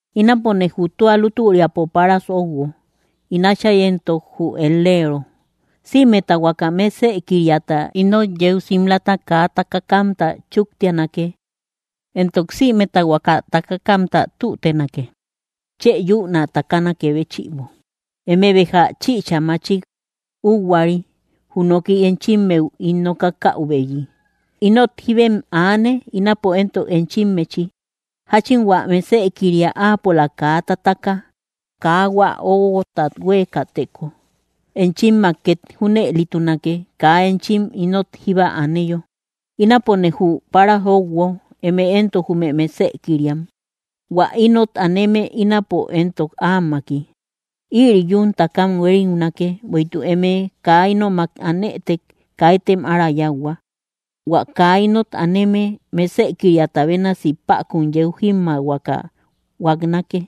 ’Ínapone jü tua lutüriapo páras óuguo, ín Átchay éntok jü et‑leero. Sïmeta huaka mesëkiriata ínot yeu simlata kaa takakamta chúktianake; éntok sïmeta huaka takakamta tútenake, chë yún ä takanakë béchïbo. Eme béja chïcha machik úhuari jü noki enchimmeu ín nokakäubeyi. Inot jíbem aane; ínapo éntok enchimmechi. Jáchin hua mesëkiria áapola kaa tataka, kaa hua óguotat huéekäteko, enchimmak két junëlitunake, kaa enchim ínot jíba aneyo. ’Ínapone jü páras óuguo, eme éntok jume mesëkiriam. Huä ínot aneme, ínapo éntok áamaki. Ïri yún takam huériunake; bueïtuk eme kaa ínomak anëtek, kaitem ára yáuhua. Huä kaa ínot aneme, mesëkiriata bénasi päkun yeu jímmaahuaka huaknake.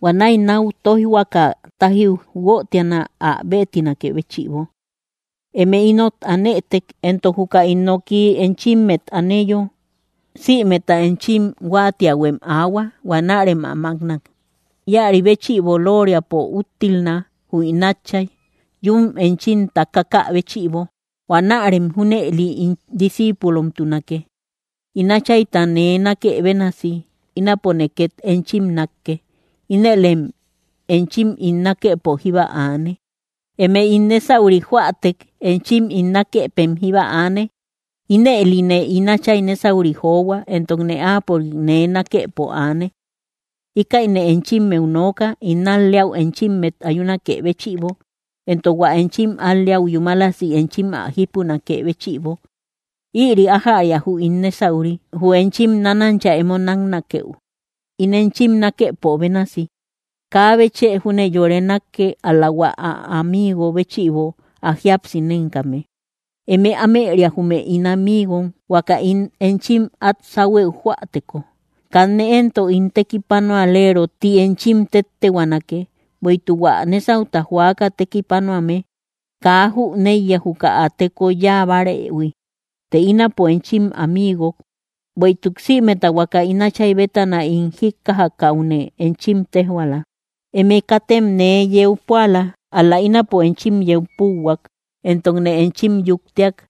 Huanäi náu tóijhuaka tájiu guötiana, ä béetinakë béchïbo. ’Eme ínot anëtek, éntok juka ín noki enchimmet aneyo, sïmeta enchim huáatiähuem aahua; huanärem ä mákna. Íäri béchïbo loriapo úttilna, jü ín Átchay, yún enchim takakä béchïbo. Huanärem junëli ín discíipulomtunake. In Áchayta nee nákë bénasi, ínapone két enchim nákke. Ínëlem enchim ín nákëpo jíba aane. Eme ín nésauri joätek, enchim ín nákëpem jíba aane; ínëline ín Áchay nésauri johua, éntokne áapörik nee nákëpo aane. ’Íkäine enchimmeu nooka, ín al‑leäu enchimmet ayunakë béchïbo, éntok hua enchim al‑leäu yúmalasi enchim ä jípunakë béchïbo. Ïri ájäria jü ín nésauri: Jü enchim nánancha emo náknakeu, ín enchim nákëpo bénasi. Kaabe chë júne yore nákke, ál‑la hua ä amigom béchïbo ä jíapsi nénkame. Eme ámëria jume ín amigom, huaka ín enchim át sáhuëu joäteko. Kanne éntok ín tekipanualero ti enchim téttehuaanake, bueïtuk hua nésauta joaka tekipanuame kaa jüneiya, juka ä teko yáa bárëhui. Të ínapo enchim amigok, bueïtuk sïmeta huaka ín Áchay bétana ín jíkkajakäune enchim téjhuaala. Eme katem nee yeu púala, ál‑la ínapo enchim yeu púuhuak, éntokne enchim yuktiak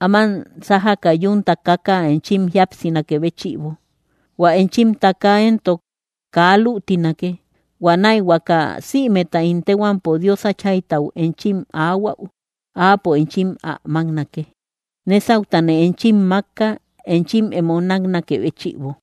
áman sájaka yún takaka enchim jíapsinakë béchïbo. Huä enchim taka éntok kaa lütinake. Huanäi huaka sïmeta ín téhuampo Dios Áchaytau enchim aahuäu, áapo enchim ä máknake. Nésautane enchim mákka, enchim emo náknakë béchïbo.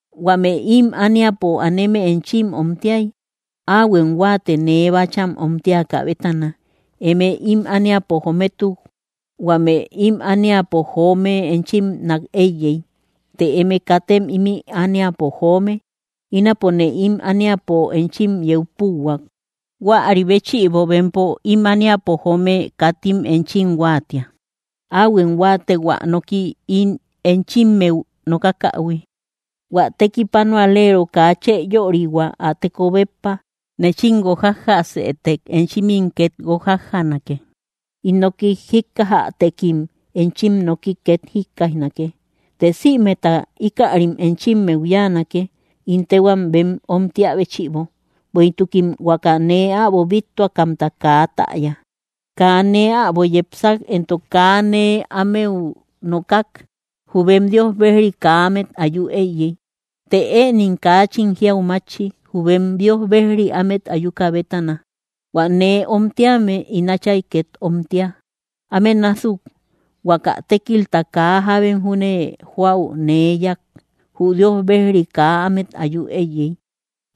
’Huame ím ániapo aneme enchim omtiay, áahuem huáate nee bácham omtiakä bétana. Eme ím ániapo jométuk, huame ím ániapo joome enchim nák éiyey. Të eme katem ím ániapo joome; ínapone ím ániapo enchim yeu púuhuak. Huäri béchïbo bempo, ím ániapo joome, katim enchim huáatia. Áahuem huáate, hua noki ín enchimmeu nokakähui: “Huä tekipanualero kaa chë yörihua ä teko béppa.” Nechim guojajjaasëtek, enchimim két guojajjanake; ín noki jíkkajätekim, enchim noki két jikkaijnake. Të sïmeta íkärim enchimmeu yáanake ín téhuam bem omtiä béchïbo, bueïtukim huaka nee äbo bíttuakamta kaa täya. ’Kaa nee äbo yepsak, éntok kaa nee ámeu nokak, jü bem Dios bejri kaa ámet ayu éiyey; të ënim kaachin jiau mátchi, jü bem Dios Bejri ámet ayuka bétana. Huä nee omtíame, ín Áchay két omtia. Áme násuk huaka tékilta kaa jábem júne joäu nee yáak, jü Dios bejri kaa ámet ayu éiyey;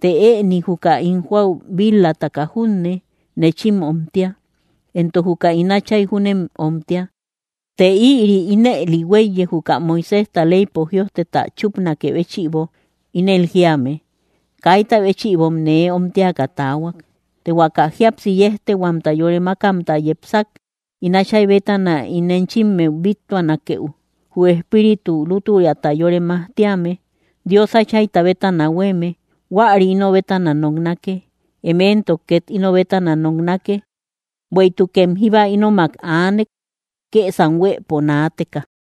të ëni juka ín joäu bil-lataka junne, nechim omtia, éntok juka ín Áchay júnem omtia. Të ïri ínëli huéiye, juka Moiséjta leypo jïojteta chúpnakë béchïbo, ínel jíame: “Kaita béchïbom nee omtiaka taahuak.” ’Të huaka jíapsi yéjtehuamta yore mákamta yepsak, ín Áchay bétana ín enchimmeu bíttuanakeu, jü Espíritu lútüriata yore majtíame, Dios Áchayta bétana huéeme, huäri ino bétana noknake. Eme éntok két ino bétana noknake, bueïtukem jíba ínomak aanek, kësam huëpo naateka.